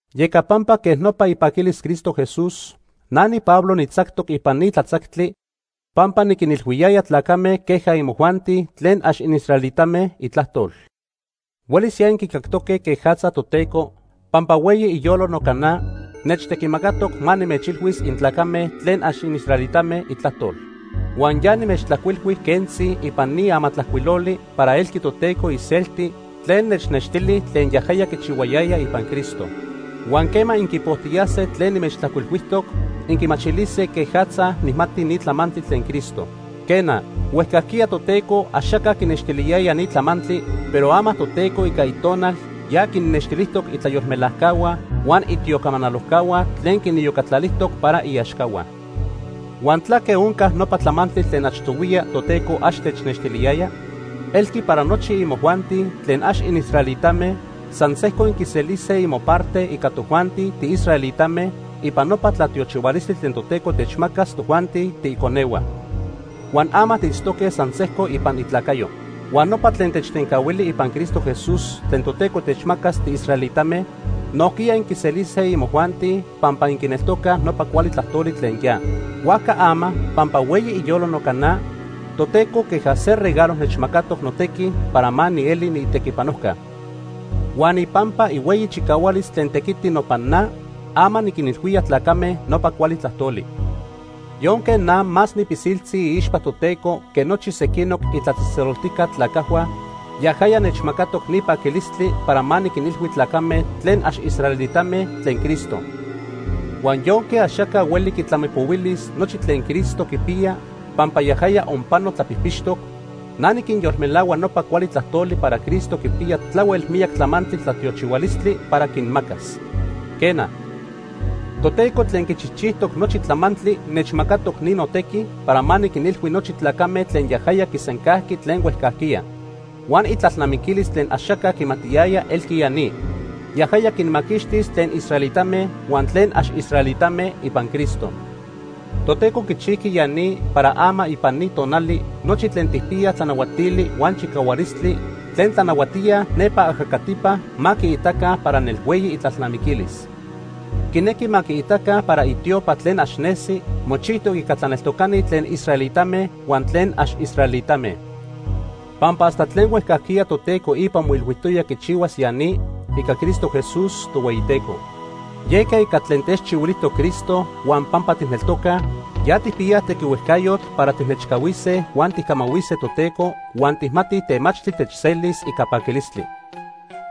Yeca pampa quej nopa ipaquilis Cristo Jesús, na niPablo nijtzactoc ipan ni tlatzactli pampa niquinilhuiyaya tlacame queja imojuanti tlen ax inisraelitame Itlajtol. Huelis ya inquicactoque quejatza Toteco, pampa hueyi iyolo noca na, nechtequimacatoc ma nimechilhuis intlacame tlen ax inisraelitame Itlajtol. Huan ya nimechtlajcuilhui quentzi ipan ni amatlajcuiloli para elqui Toteco iselti tlen nechnextili tlen yajaya quichihuayaya ipan Cristo. Huan quema inquipojtiyase tlen nimechtlajcuilhuijtoc, inquimachilise quejatza nijmati ni tlamantli tlen Cristo. Quena, huejcajquiya Toteco axaca quinextiliyaya ni tlamantli, pero ama Toteco ica Itonal ya quinnextilijtoc itlayolmelajcahua huan itiocamanalojcahua tlen quiniyocatlalijtoc para iaxcahua. Huan ¿tlaque onca nopa tlamantli tlen achtohuiya Toteco ax tenextiliyaya? Elqui para nochi imojuanti tlen ax inisraelitame san sejco inquiselise imoparte ica tojuanti tiisraelitame ipan nopa tlatiochihualistli tlen Toteco techmacas tojuanti tiiconehua. Huan ama tiitztoque san sejco ipan itlacayo. Huan nopa tlen techtencahuili ipan Cristo Jesús tlen Toteco techmacas tiisraelitame, nojquiya inquiselise imojuanti pampa inquineltocaj nopa cuali tlajtoli tlen ya. Huajca ama pampa hueyi iyolo noca na, Toteco queja se regalo nechmacatoc notequi para ma nieli niitequipanojca. Huan ipampa ihueyi chicahualis tlen tequiti nopan na, ama niquinilhuía tlacame nopa cuali tlajtoli. Yonque na más nipilsiltzi iixpa Toteco que nochi sequinoc itlatzejtzeloltijca tlacajhua, yajaya nechmacatoc ni paquilistli para ma niquinilhui tlacame tlen ax israelitame tlen Cristo. Huan yonque axaca hueli quitlamipohuilis nochi tlen Cristo quipiya pampa yajaya onpano tlapijpixtoc, na niquinyolmelahua nopa cuali tlajtoli para Cristo quipiya tlahuel miyac tlamantli tlatiochihualistli para quinmacas. Quena, Toteco tlen quichijchijtoc nochi tlamantli nechmacatoc ni notequi para ma niquinilhui nochi tlacame tlen yajaya quisencajqui tlen huejcajquiya. Huan itlalnamiquilis tlen axaca quimatiyaya elqui ya ni; yajaya quinmaquixtis tlen israelitame huan tlen ax israelitame ipan Cristo. Toteco quichijqui ya ni para ama ipan ni tonali nochi tlen quipiyaj tlanahuatili huan chicahualistli tlen tlanahuatíaj nepa ajacatipa ma quiitaca para nelhueyi itlalnamiquilis. Quinequi ma quiitaca para itiopa tlen ax nesi, mochijtoc ica tlaneltocani tlen israelitame huan tlen ax israelitame. Pampa hasta tlen huejcajquiya Toteco ipa moilhuijtoya quichihuas ya ni ica Cristo Jesús, Tohueyiteco. Yeca ica tlaque techchihuilijtoc Cristo huan pampa tijneltoca, ya tijpiyaj tequihuejcayotl para tijnechcahuise huan tijcamahuise Toteco huan tijmatij temachtli techselis ica paquilistli.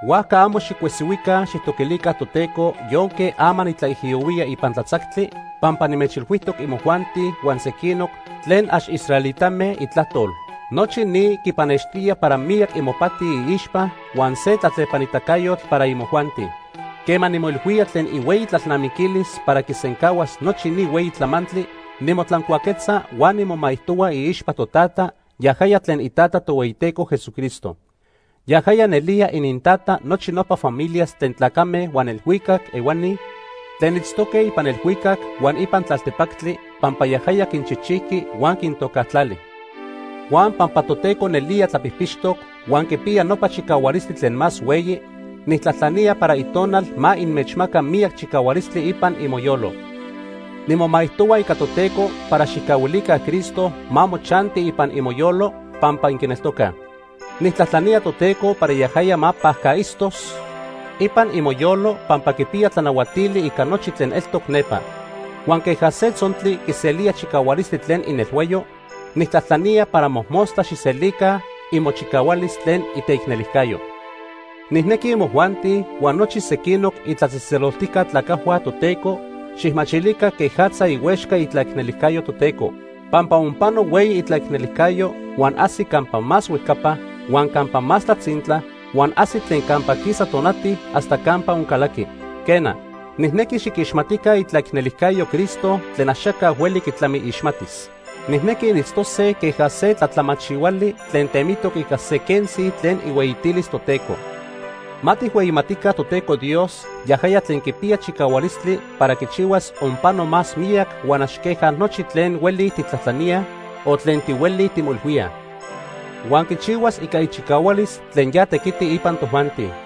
Huajca amo xicuesihuica xijtoquilica Toteco yonque ama nitlaijiyohuía ipan tlatzactli pampa nimechilhuijtoc imojuanti huan sequinoc tlen ax israelitame Itlajtol. Nochi ni quipannextía para miyac imopati iixpa huan se tlatlepanitacayotl para imojuanti. Quema nimoilhuía tlen ihueyi tlalnamiquilis para quisencahuas nochi ni hueyi tlamantli, nimotlancuaquetza huan nimomaijtohua iixpa Totata, yajaya tlen iTata Tohueyiteco Jesucristo. Yajaya nelía inintata nochi nopa familias tlen tlacame huan elhuicac ehuani tlen itztoque ipan elhuicac huan ipan tlaltepactli pampa yajaya quinchijchijqui huan quintocajtlali. Huan pampa Toteco nelía tlapijpixtoc huan quipiya nopa chicahualistli tlen más hueyi, nijtlajtlanía para Itonal ma inmechmaca miyac chicahualistli ipan imoyolo. Nimomaijtohua ica Toteco para xijcahuilica Cristo ma mochanti ipan imoyolo pampa inquineltocaj. Nijtlajtlanía Toteco para yajaya ma pajcaitztos ipan imoyolo pampa quipiya tlanahuatili ica nochi tlen eltoc nepa. Huan queja se tzontli quiselía chicahualistli tlen inelhuayo, nijtlajtlanía para mojmostla xijselica imochicahualis tlen iteicnelijcayo. Nijnequi imojuanti huan nochi sequinoc itlatzejtzeloltijca tlacajhua Toteco xijmachilica quejatza ihuexca itlaicnelicayo Toteco. Pampa onpano hueyi itlaicnelijcayo huan ajsi campa más huejcapa, huan campa más tlatzintla, huan ajsi tlen campa quisa tonati hasta campa oncalaqui. Quena, nijnequi xiquixmatica itlaicnelijcayo Cristo tlen axaca hueli quitlamiixmatis. Nijnequi initztose queja se tlatlamachihuali tlen temitoc ica se quentzi tlen ihueyitilis Toteco. Ma tijhueyimatica Toteco Dios yajaya tlen quipiya chicahualistli para quichihuas onpano más miyac huan ax queja nochi tlen hueli tijtlajtlaníaj o tlen tihuelij timoilhuíaj. Huan quichihuas ica ichicahualis tlen ya tequiti ipan tojuanti.